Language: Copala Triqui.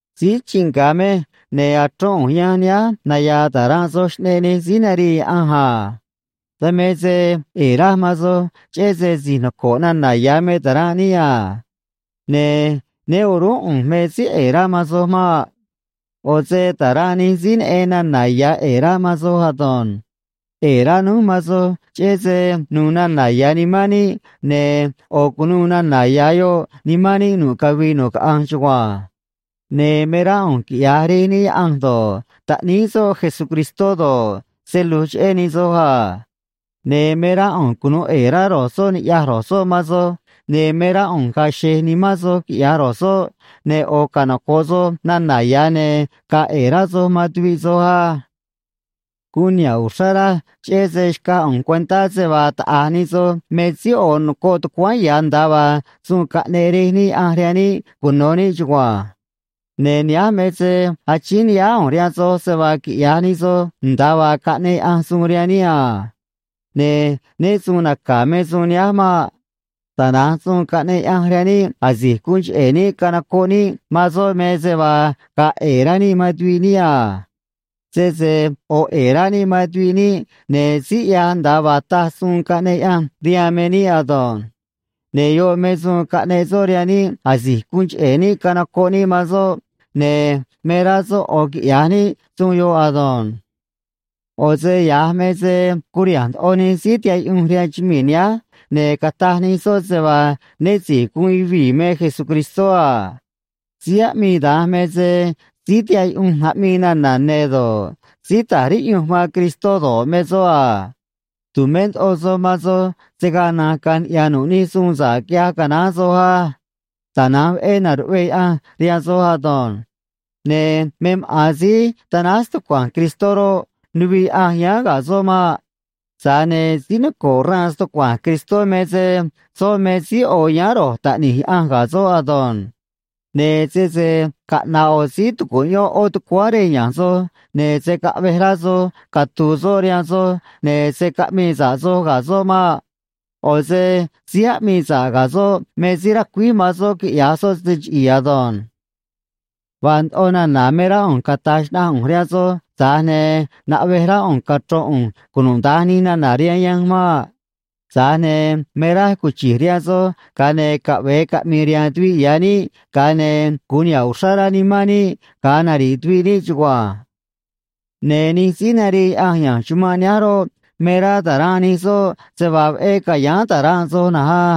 Síí chii nga̱ mej, ne̱ achrón ꞌu̱nj yanj nihánj naya̱a̱ ta̱ranꞌ soj xꞌneꞌ nij síí narii Yaꞌanj a. Dan me se ꞌe̱e̱ raj man soj, cheꞌé se si̱j noco̱ꞌ nana̱ ya̱ me ta̱ranꞌ níꞌ a. Ne̱ né o̱rúnꞌ ꞌu̱nj me síí ꞌe̱e̱ rá man soj maꞌ. ꞌO̱ se ta̱ranꞌ nij síí neꞌen nana̱ ya̱ ꞌe̱e̱ rá man soj ado̱nj. ꞌE̱e̱ rá núj man soj cheꞌé se nu̱u̱ nana̱ ya̱ nimán níꞌ, ne̱ ꞌo̱ cu̱nuû nana̱ ya̱ yoꞌ nimán níꞌ nu̱ꞌ cavii nu̱ꞌ caꞌanj chugua̱nj. Ne̱ me rá ꞌu̱nj quiꞌya̱j Rej níꞌ Yaꞌanj do̱ꞌ, Taꞌníí soꞌ Jesucristó do̱ꞌ, se lu̱j cheꞌé nij soj a. Ne̱ me rá ꞌu̱nj cunu̱u ꞌe̱e̱ rá ro̱j soꞌ ni̱ꞌyaj ro̱j soꞌ man soj, ne̱ me rá ꞌu̱nj ga̱a̱ xe̱j nimán soj quiꞌya̱j ro̱j soꞌ, ne̱ ꞌo̱ canoco̱ꞌ soj nana̱ ya̱ ne̱ ga̱a̱ ꞌe̱e̱ rá soj man tuviꞌ soj á. Guun niha̱ꞌ uxrá raj, cheꞌé se xcaj ꞌu̱nj cuentá se vaa taꞌa̱j nij soj me síí ꞌo̱ nocoꞌ tucuáán ya̱, nda̱a vaa suun caꞌneꞌ Rej níꞌ Yaꞌanj rihaan níꞌ cuno̱ níꞌ chugua̱nj. Ne̱ nihánj me se achíín ni̱ꞌyáá ꞌu̱nj rihaan soj se vaa quiꞌya̱j nij soj nda̱a vaa caꞌneꞌ Yaꞌanj suun rihaan níꞌ a. Ne̱ né su̱u̱n naca̱ me suun nihánj maꞌ. Tana̱nj suun caꞌneꞌ Yaꞌanj rihaan níꞌ asi̱j guun cheꞌe̱ níꞌ canocoꞌ níꞌ man soꞌ me se vaa ga̱a̱ ꞌe̱e̱ rá níꞌ man tuviꞌ níꞌ a. Sese ꞌo̱ ꞌe̱e̱ rá níꞌ man tuviꞌ níꞌ, ne̱ síí ꞌyaj nda̱a vaa taj suun caꞌneꞌ Yaꞌanj rihaan me níꞌ ado̱nj. Ne̱ yoꞌ me suun caꞌneꞌ soꞌ rihaan níꞌ asi̱j guun cheꞌe̱ níꞌ canocoꞌ níꞌ man soꞌ, ne̱ me rá soꞌ ꞌo̱ quiꞌya̱j níꞌ suun yoꞌ ado̱nj. ꞌO̱ se ya̱j me se curiha̱nj ndoꞌo nij síí tihaꞌ yuꞌunj rihaan chumii̱ nihánj, ne̱ cataj nij soꞌ se vaa né si̱j guun yuvii̱ me Jesucristó a. Síí aꞌmii da̱nj me se síí tihaꞌ yuꞌunj aꞌmii nana̱ ne̱ do̱ꞌ, síí ta̱j riꞌyunj man Cristó do̱ꞌ, me soꞌ a. Tu̱mé ndoꞌo soj man soj se̱ gaa na̱nj caꞌanj niꞌya̱ nu̱ꞌ nij suun sa̱ꞌ quiꞌyaj canaán soj á. Tana̱nj veꞌé na̱ruꞌvee Yaꞌanj rihaan soj ado̱nj. Ne̱ me maꞌa̱n síí tanáj stucua̱nj Cristó roꞌ, nuviꞌ Yaꞌanj yáán ga̱ soꞌ maꞌ. Tza̱j ne̱ síí noco̱ꞌ xraan stucua̱nj Cristó me se soꞌ me síí ꞌo̱ yáán ro̱j Taꞌni̱j Yaꞌanj ga̱ soꞌ ado̱nj. Ne̱ sese caꞌna̱ꞌ ꞌo̱ síí tucuꞌyón ꞌó tucuáán rej ya̱nj soj, ne̱ se̱ caꞌvej rá soj catu̱u̱ soꞌ rihaan soj, ne̱ se̱ caꞌmii sa̱ꞌ soj ga̱ soꞌ maꞌ. ꞌO̱ se síí aꞌmii sa̱ꞌ ga̱ soꞌ me síí racuíj man soꞌ quiꞌya̱j soꞌ se chiꞌi̱i̱ ado̱nj. Vaa ndoꞌo nana̱ me rá ꞌu̱nj cata̱j xnaꞌanj ꞌu̱nj rihaan soj, tza̱j ne̱ naꞌvej rá ꞌu̱nj cachro̱n ꞌu̱nj cunuda̱nj nij nana̱ rihaan yanj maꞌ. Tza̱j ne̱ me raj cuchi̱j rihaan soj, ga̱a ne̱ caꞌve̱e caꞌmi̱i̱ rihaan tuviꞌ ya̱ níꞌ, ga̱a ne̱ gu̱un niha̱ꞌ uxrá rá nimán níꞌ ga̱a nari̱ꞌ tuviꞌ níꞌ chugua̱nj. Ne̱ nij síí narii Yaꞌanj ya̱nj chumanꞌ nihánj roꞌ, me rá ta̱ranꞌ nij soꞌ se vaa veꞌé ca̱yáán ta̱ranꞌ soj na̱nj á.